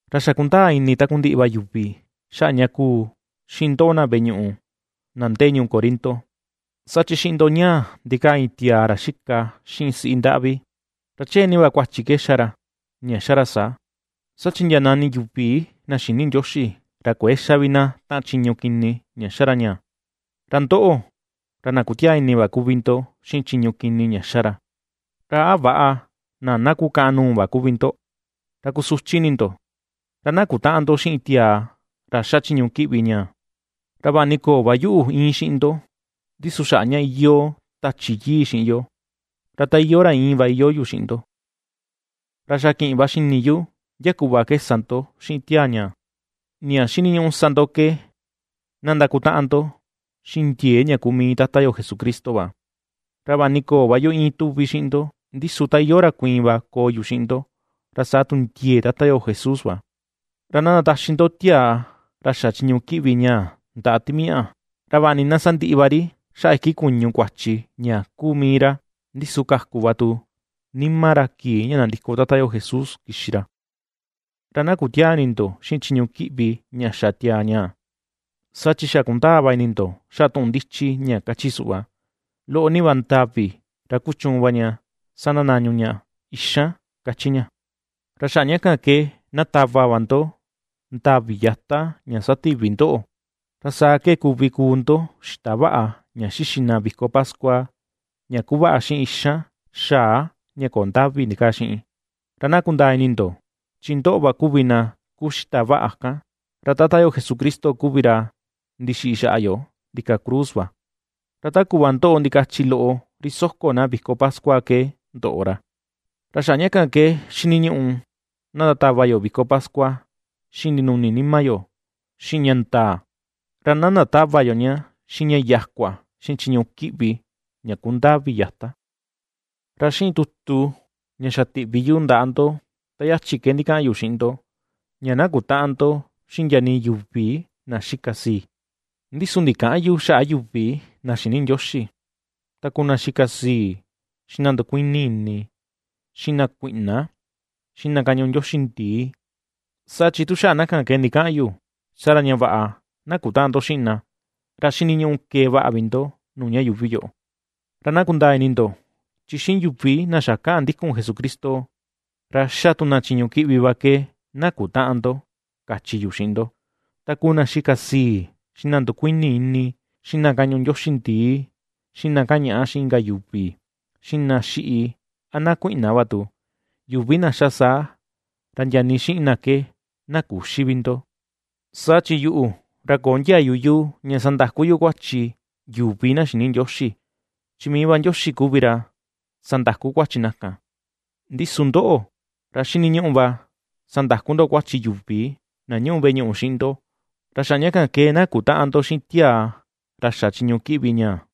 Ra xa kundaa ini takundiꞌi va yuvi xaꞌa ña kuu xiꞌin ndoꞌo na veꞌe ñuꞌu na ndee ñuu Corinto, saa chi xiꞌin ndo ñaa, ndikaa iin tiaa ra xika xiꞌin siꞌi ndaꞌvi. Ra chee nii va kuachi ke ^xa ra, ña ^xa ra saa, saa chi ndia nani yuvi na xïni Ndioxi, ra kuëe xa vi na taꞌan chiñu kini ña ^xa ra ñaa. ¡Ra ndoꞌo, ra na kutiaa ini va kuvi ndo xiꞌin chiñu kini ña ^xa ra! ¡Ra a väꞌa, na na kukaꞌan nuu va kuvi ndo, ra kusuchi ini ndo! Ra na kutäꞌan ndo xiꞌin tiaa ra ^xa chiñu kiꞌvi ñaa. Ra vaꞌa ni köo va yuꞌu íin xiꞌin ndo, ndi su xaꞌa ña iyoo Tachi Yii xiꞌin yo, ra ta iyoo ra íin va iyoo yu xiꞌin ndo, ra xa kiꞌin va xini yu ndia kuꞌva ke sa ndo xiꞌin tiaa ñaa. Ña xiniñuꞌu sa ndo ke na ndakutaꞌan ndo xiꞌin ndiee ña kuu mii Tata yo Jesucristo va, ra vaꞌa ni köo va yu íin tuvi xiꞌin ndo, ndi su ta iyoo ra kuiin va koo yu xiꞌin ndo, ra saa tu ndiee Tata yo Jesús va. Ra na ndataxi ndo tiaa ra xa chiñu kiꞌvi ñaa ndaꞌa timiaꞌa, ra vaꞌa ni na sandiꞌi va ri xaꞌa iki kuñu kuachi ña kuu mii ra, ndi su kaku va tu nima ra kii ña nandiko Tata yo Jesús kixi ra. Ra na kutiäa ini ndo xiꞌin chiñu kiꞌvi ña xa tiaa ñaa. Saa chi xa kundaa va ini ndo xaꞌa tuꞌun ndichi ña kachi suꞌva: “Loꞌo ni va ndavi, ra kuchuun va ña sandanañu ña ixan”, ^kachi ña. Ra xaꞌa ña kan ke na tava va ndo ndavi yata ña sativi ndoꞌo, ra saa ke kuvi kuu ndo xita vaꞌa ña xixi na viko pascua, ña kuvaꞌa xiꞌin ixan xaa ña köo ndavi ndikaa xiꞌin. Ra na kundaa ini ndo, chi ndoꞌo va kuvi na kuu xita vaꞌa kan. Ra Tata yo Jesucristo kuvi ra ndixiꞌi xaꞌa yo ndika cruz va, ra ta kuꞌva ndoꞌo ndikachi loꞌo ri soko na viko pascua ke ndoꞌo ra. Ra xaꞌa ña kan ke xiniñuꞌu na ndatava yo viko pascua, xiꞌin ndinuni nima yo, xiꞌin ña ndaa, ra na ndatäva yo ña xiꞌin ña yakua, xiꞌin chiñu kiꞌvi, ña kuu ndavi yata. Ra xiꞌin tutu ña xa tiꞌvi yu ndaꞌa ndo ta yachi ke xa ndikaꞌan yu xiꞌin ndo, ña na kutäꞌan ndo xiꞌin ndia nii yuvi na xika sii. Ndi su ndikäꞌan yu xaꞌa yuvi na xïni Ndioxi, ta kuu na xika sii, xiꞌin na ndukuini ini, xiꞌin na kuiꞌna, xiꞌin na kañuꞌu ndioxi ndii; saa chi tu xaꞌa na kan ke ndikaꞌan yu, saa ra ña vaꞌa na kutäꞌan ndo xiꞌin na, ra xiniñuꞌu kee vaꞌa vi ndo nuu ña yuuvi yoꞌo. Ra na kundaa ini ndo, chi xiꞌin yuvi na xa kaꞌan ndikun Jesucristo, ra ^xa tu na chiñu kiꞌvi va ke na kutäꞌan ndo kachi yu xiꞌi ndo, ta kuu na xika sii, xiꞌin na ndukuini ini, xiꞌin na kañuꞌu ndioxi ndii, xiꞌin na kañaꞌa xiꞌin inka yuvi, xiꞌin na xiꞌi a na kuiꞌna va tu, yuvi na ^xa saa ra ndia nii xiꞌin na ke na küxi vi ndo. Saa chi yuꞌu, ra köo ndiayu yu ña sandaku yu kuachi yuvi na xïni Ndioxi; chi mii va Ndioxi kuvi ra sandaku kuachi na kan. Ndi su ndoꞌo, ra xiniñuꞌu va sandaku ndo kuachi yuvi na ñuꞌu veꞌe ñuꞌu xiꞌin ndo. Ra xaꞌa ña kan ke, na kutäꞌan ndo xiꞌin tiaa ra xa chiñu kiꞌvi ñaa.